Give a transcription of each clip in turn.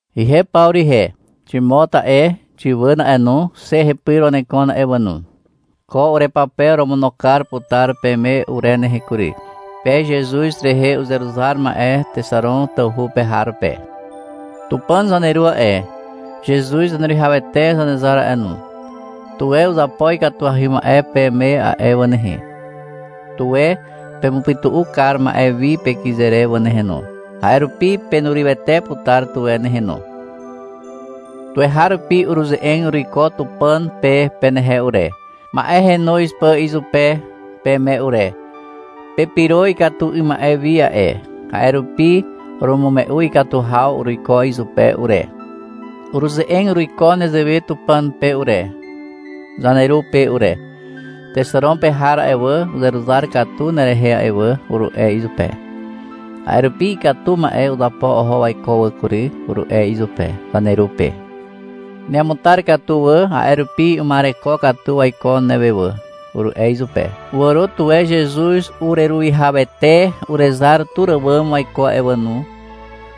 Ihe Pawru ihe. Ximot a'e, Xiwàn a'e no, xe hepyr wanekon a'e wà no. Ko urepape oromono kar putar peme ure nehe kury. Pe Zezuz rehe uzeruzar ma'e Texaron tawhu pe har pe. Tupàn zaneru a'e, Zezuz Zaneruwihawete Zanezar a'e no, tuwe uzapo ikatuahy ma'e peme a'e wà nehe. Tuwe pemupytu'u kar ma'e wi pekyze re wà nehe no. A'e rupi penurywete putar tuwe nehe no. Tuweharupi uruze'eg uruiko Tupàn pe penehe ure, ma'e henoz pà izupe peme ure. Pepyro ikatu 'ym ma'e wi a'e, a'e rupi urumume'u ikatu haw uruiko izupe ure. Uruze'eg uruiko nezewe Tupàn pe ure, zaneru pe ure. — Texaron pe har a'e wà, uzeruzar katu nerehe a'e wà, uru'e izupe. — A'e rupi ikatu ma'e uzapo oho waiko wà kury, uru'e izupe, zaneru pe. — Neamutar katu wà, a'e rupi uma'ereko katu waiko newe wà, uru'e izupe. — Wàro tuwe Zezuz ureruwihawete urezar tur àwàm waiko wà no,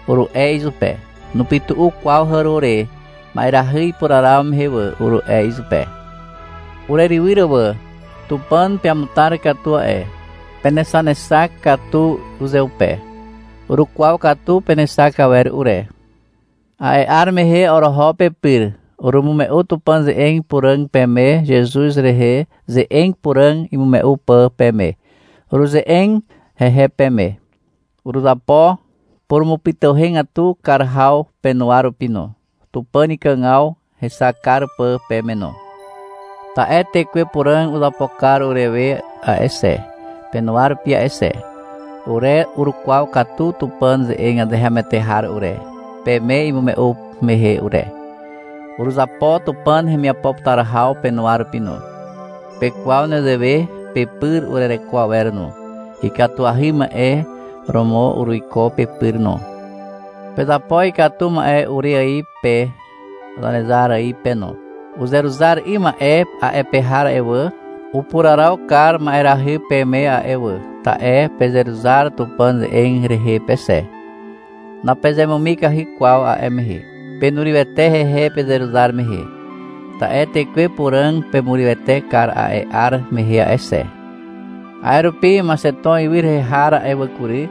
uru'e izupe. — Nupytu'u kwaw hàro re, ma'erahy ipuraraw mehe wà, uru'e izupe. Urerywyr wà. Tupàn peamutar katu a'e. Penexanexak katu uzeupe. Urukwaw katu penexak awer ure. A'e 'ar mehe oroho pepyr, urumume'u Tupàn ze'eg puràg peme, Zezuz rehe ze'eg puràg imume'u pà peme. Uruze'eg hehe peme. Uruzapo purumupytuhegatu kar haw penuwa rupi no, Tupàn ikàgaw hexak kar pà peme no. Ta'e Tekwe Puràg uzapo kar urewe a'e xe, penuwa rupi a'e xe. Ure urukwaw katu Tupàn ze'eg azeharomoete har ure, peme imume'u mehe ure. Uruzapo Tupàn hemiapo putar haw penuwa rupi no. Pekwaw nezewe pepyr urereko awer no. Ikatuahy ma'e romo uruiko pepyr no. Pezapo ikatu ma'e ure ài pe, Zanezar ài pe no. Uzeruzar 'ym ma'e a'e pe har a'e wà, upuraraw kar ma'erahy peme a'e wà, ta'e pezeruzar Tupàn ze'eg rehe pe xe. Napezemumikahy kwaw a'e mehe. Penurywete hehe pezeruzar mehe. Ta'e Tekwe Puràg pemurywete kar a'e 'ar mehe a'e xe. A'e rupi Maxeton ywy rehe har a'e wà kury,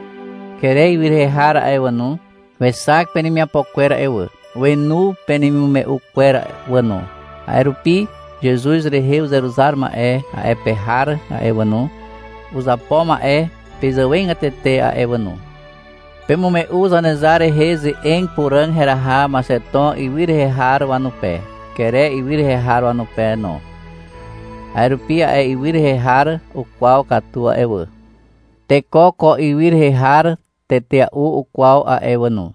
Kere ywy rehe har a'e wà no, wexak penemiapo kwer a'e wà. Wenu penemimume'u kwer wà no. A'e rupi Zezuz rehe uzeruzar ma'e a'e pe har a'e wà no, uzapo ma'e pezàwegatete a'e wà no. Pemume'u Zanezar rehe ze'eg puràg heraha Maxeton ywy rehe har wanupe, Kere ywy rehe har wanupe no. A'e rupi a'e ywy rehe har ukwaw katu a'e wà. Teko ko ywy rehe har tetea'u ukwaw a'e wà no.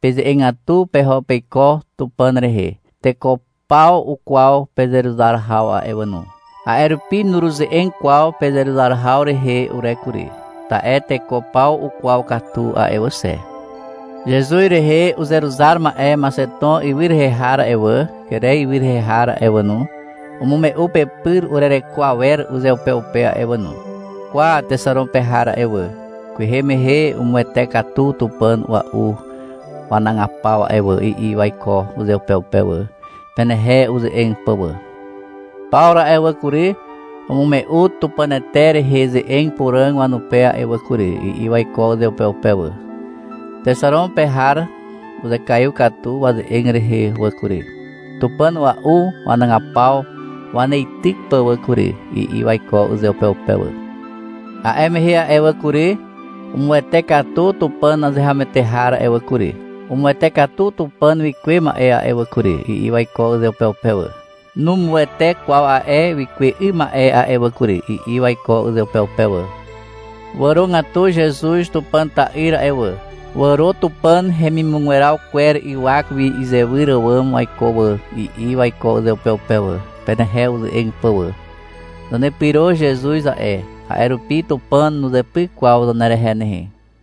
Peze'egatu peho peiko Tupàn rehe. Teko paw ukwaw pezeruzar haw a'e wà no. A'e rupi nuruze'eg kwaw pezeruzar haw rehe ure kury. Ta'e teko paw ukwaw katu a'e wà xe. Zezuz rehe uzeruzar ma'e Maxeton ywy rehe har a'e wà, Kere ywy rehe har a'e wà no, umume'u pepyr urereko awer uzeupeupe a'e wà no. — Kwa, Texaron pe har a'e wà, kwehe mehe umuwete katu Tupàn a'ua'u wanagapaw a'e wà, i'i waiko uzeupeupe wà, penehe uze'eg pà wà. — Pawru a'e wà kury, umume'u Tupànete rehe ze'eg puràg wanupe a'e wà kury, i'i waiko uzeupeupe wà. Texaron pe har uzekaiw katu waze'eg rehe wà kury, tupàn a'ua'u wanagapaw waneityk pà wà kury, i'i waiko uzeupeupe wà. — A'e mehe a'e wà kury, umuwete katu Tupàn azeharomoete har a'e wà kury. Umuwete katu Tupàn wikuwe ma'e a'e wà kury, i'i waiko uzeupeupe wà. Numuwete kwaw a'e wikuwe 'ym ma'e a'e wà kury, i'i waiko uzeupeupe wà. — Wàrogatu Zezuz Tupàn ta'yr a'e wà. Wàro Tupàn hemimugweraw kwer ywak wi izewyr àwàm waiko wà, i'i waiko uzeupeupe wà, penehe uze'eg pà wà. Zanepyro Zezuz a'e, a'e rupi Tupàn nuzepyk kwaw zanerehe nehe.